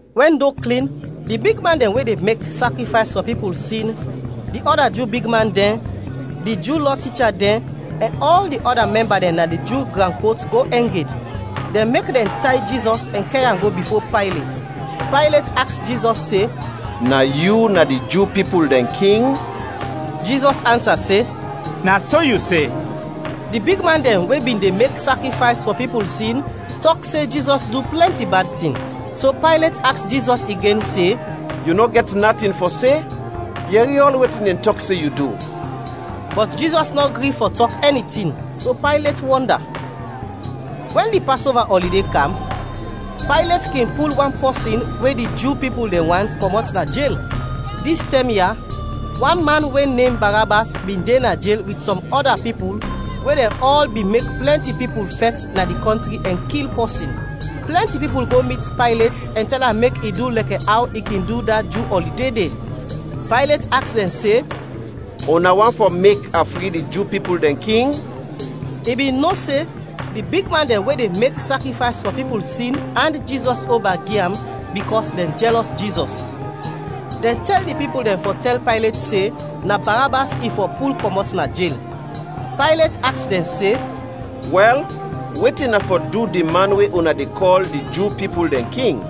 Wɛn do klin, di bigman dɛn we de mek sakrifays fɔ pipul sin, di ɔda Ju bigman dɛn, di Ju Lɔ ticha dɛn, ɛn ɔl di ɔda mɛmba dɛn na di Ju gran kot go ɛng ed. Dɛn mek dɛn tay Jizɔs ɛn kɛr am go bifo Paylet. Paylet aks Jizɔs se, “Na yu na di Ju pipul dɛn king?” Jizɔs ansa se, “Na so yu se!” Di bigman dɛn we bin de mek sakrifays fɔ pipul sin tɔk se Jizɔs du plɛnti bad tin, so Paylet aks Jizɔs igen se, “Yu nɔ gɛt natin fɔ se? Yɛri ɔl wetin dɛn tɔk se yu du!” Bɔt Jizɔs nɔ gri fɔ tɔk ɛni tin, so Paylet wɔnda. Wɛn di Pasova ɔlide kam, Paylet kin pul wan pɔsin we di Ju pipul dɛn want, kɔmɔt na jel. Dis tɛm ya, wan man we nem Barabas bin de na jel wit sɔm ɔda pipul we dɛn ɔl bin mek plɛnti pipul fɛt na di kɔntri ɛn kil pɔsin. Plɛnti pipul go mit Paylet ɛn tɛl am mek i du lɛkɛ aw i kin du da Ju ɔlide de. Paylet aks dɛn se, “Una want fɔ mek a fri di Ju pipul dɛn king?” I bin no se di bigman dɛn we de mek sakrifays fɔ pipul sin and Jizɔs oba gi am bikɔs dɛn jɛlɔs Jizɔs. Dɛn tɛl di pipul dɛn fɔ tɛl Paylet se, na Barabas i fɔ pul kɔmɔt na jel. Paylet aks dɛn se, “Wɛl, wetin a fɔ du di man we una de kɔl di Ju pipul dɛn king?”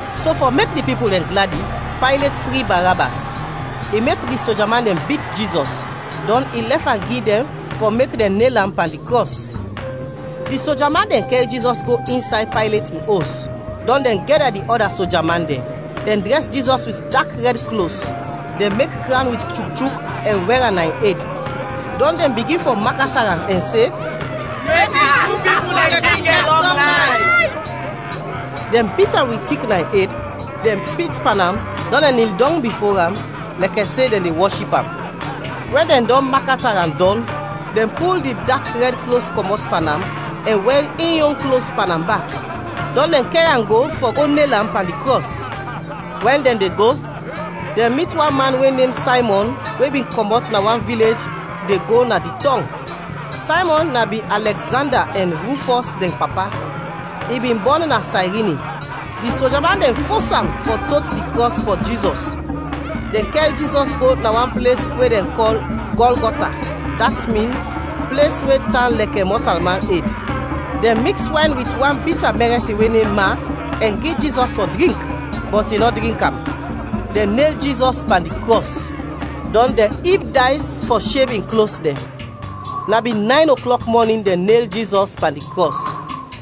So fɔ mek di pipul dɛn gladi, Paylet fri Barabas. I mek di soja man dɛn bit Jizɔs, dɔn i lɛf am gi dɛn fɔ mek dɛn nel am pan di krɔs. Di soja man dɛn kɛr Jizɔs go insay Paylet in os, dɔn dɛn gɛda di ɔda soja man dɛn. Dɛn drɛs Jizɔs wit dak rɛd klos, dɛn mek krawn wit chukchuk ɛn wɛr am na in ed. Dɔn dɛn bigin fɔ makata am ɛn se, “Mek di Ju pipul dɛn King gɛt lɔng layf!” Dɛn bit am wit tik na in ed, dɛn pit pan am, dɔn dɛn nil dɔng bifo am lɛkɛ se dɛn de wɔship am. Wɛn dɛn dɔn makata am dɔn, dɛn pul di dak rɛd klos kɔmɔt pan am, ɛn wɛr in yon klos pan am bak; dɔn dɛn kɛr am go fɔ go nel am pan di krɔs. We dɛn de go, dɛn mit wan man we nem Saymɔn we bin kɔmɔt na wan vilej de go na di tɔng. Saymɔn na bin Alɛgzanda ɛn Rufɔs dɛn papa. I bin bɔn na Sayrini. Di soja man dɛn fos am fɔ tot di krɔs fɔ Jizɔs. Dɛn kɛr Jizɔs go na wan ples we dɛn kɔl Gɔlgɔta, dat min “Ples we tan lɛkɛ mɔtalman ed.” Dɛn miks wayn wit wan bita mɛrɛsin we nem ma, ɛn gi Jizɔs fɔ drink, bɔt i nɔ drink am. Dɛn nel Jizɔs pan di krɔs, dɔn dɛn ib days fɔ sheb in klos dɛn. Na bin nayn oklɔk mɔnin dɛn nel Jizɔs pan di krɔs.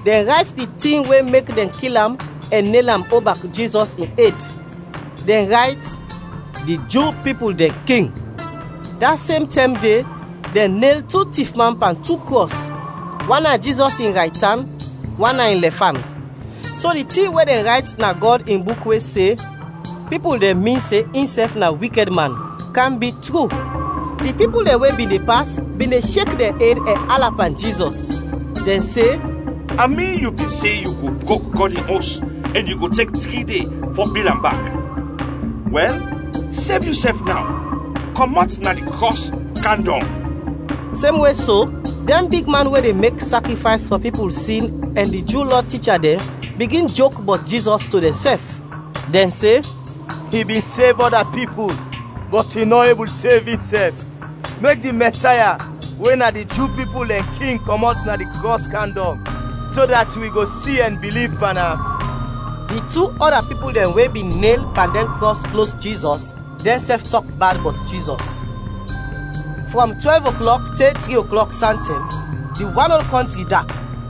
Dɛn rayt di tin we mek dɛn kil am ɛn nel am oba Jizɔs in ed. Dɛn rayt “Di Ju Pipul Dɛn King.” Da sem tɛm de dɛn nel tu tifman pan tu krɔs, wan na Jizɔs in raytan, wan na in lɛfan. [ So di tin we dɛn rayt na Gɔd in Buk we se, “Pipul dɛn min se insɛf na wikɛd man,” kam bi tru.] Di pipul dɛn we bin de pas bin de shek dɛn ed ɛn ala pan Jizɔs. Dɛn se, “A min yu bin se yu go brok Gɔd in Os, ɛn yu go tek tri de fɔ bil am bak. Wɛl, sev yusɛf naw, kɔmɔt na di krɔs, kam dɔng!” Semwe so, dɛn bigman we de mek sakrifays fɔ pipul sin ɛn di Ju Lɔ ticha dɛn bigin jok bɔt Jizɔs to dɛnsɛf. Dɛn se, “I bin de sev ɔda pipul, bɔt i nɔ ebul sev insɛf! Mek di Mɛsaya, we na di Ju pipul dɛn king kɔmɔt na di krɔs kam dɔng, so dat wi go si ɛn biliv pan am!” Di tu ɔda pipul dɛn we bin nel pan dɛn krɔs klos Jizɔs, dɛnsɛf tɔk bad bɔt Jizɔs. Frɔm twɛlv oklɔk te tri oklɔk santɛm, di wan ol kɔntri dak.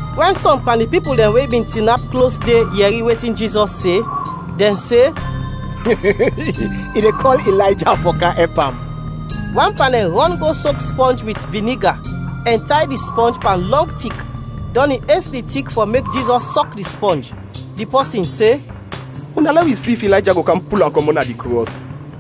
Wɛn sɔm pan di pipul dɛn we bin tinap klos de yɛri wetin Jizɔs se, dɛn se, “I de kɔl Ilayja fɔ kam ɛp am.” Wan pan dɛn rɔn go sok spɔnj wit viniga ɛn tay di spɔnj pan lɔng tik, dɔn i es di tik fɔ mek Jizɔs sɔk di spɔnj. Di pɔsin se, “Una lɛ wi si if Ilayja go kam pul am kɔmɔt na di krɔs!”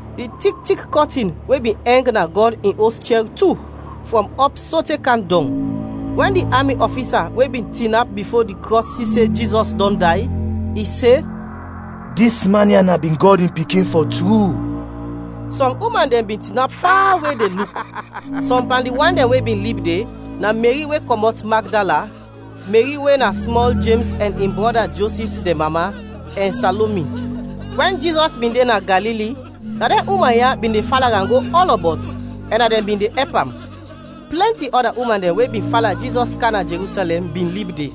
Di tik tik kɔtin we bin ɛng na Gɔd in Os chɛr tu, frɔm ɔp sote kam dɔng. Wɛn di ami ɔfisa we bin tinap bifo di krɔs si se Jizɔs dɔn day, i se, “Dis man ya na bin Gɔd in Pikin, fɔ tru!” Sɔm uman dɛn bin tinap fawe de luk. Sɔm pan di wan dɛn we bin lib de na Meri we kɔmɔt Magdala, Meri we na smɔl Jems ɛn in brɔda Josis dɛn mama, ɛn Salomi. Wɛn Jizɔs bin de na Galili na dɛn uman ya bin de fala am go ɔlɔbɔt ɛn na dɛn bin de ɛp am. Plɛnti ɔda uman dɛn we bin fala Jizɔs kam na Jerusɛlɛm bin lib de.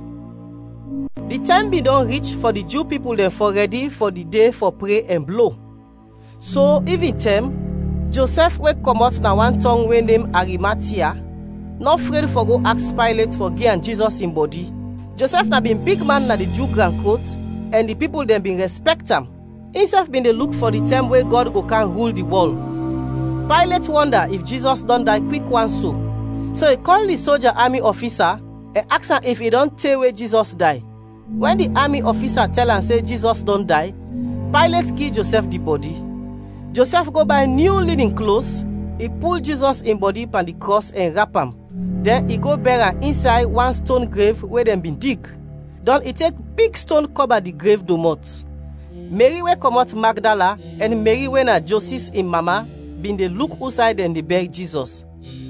Di tɛm bin dɔn rich fɔ di Ju pipul dɛn fɔ rɛdi fɔ di de fɔ pre ɛn blo. So ivintɛm, Josɛf we kɔmɔt na wan tɔng we nem Arimatia, nɔ fred fɔ go aks Paylet fɔ gi am Jizɔs in bɔdi. Josɛf na bin bigman na di Ju gran kot ɛn di pipul dɛn bin rɛspɛkt am; insɛf bin de luk fɔ di tɛm we Gɔd go kam rul di wɔl. Paylet wɔnda if Jizɔs dɔn day kwik wan so, so i kɔl di soja ami ɔfisa ɛn aks am if i dɔn te we Jizɔs day. Wɛn di ami ɔfisa tɛl am se Jizɔs dɔn day, Paylet gi Josɛf di bɔdi. Josɛf go bay nyu linin klos, i pul Jizɔs in bɔdi pan di krɔs ɛn rap am, dɛn i go bɛr am insay wan ston grev we dɛn bin dig; dɔn i tek big ston kɔba di grev domɔt. Meri we kɔmɔt Magdala ɛn Meri we na Josis in mama bin de luk usay dɛn de bɛr Jizɔs.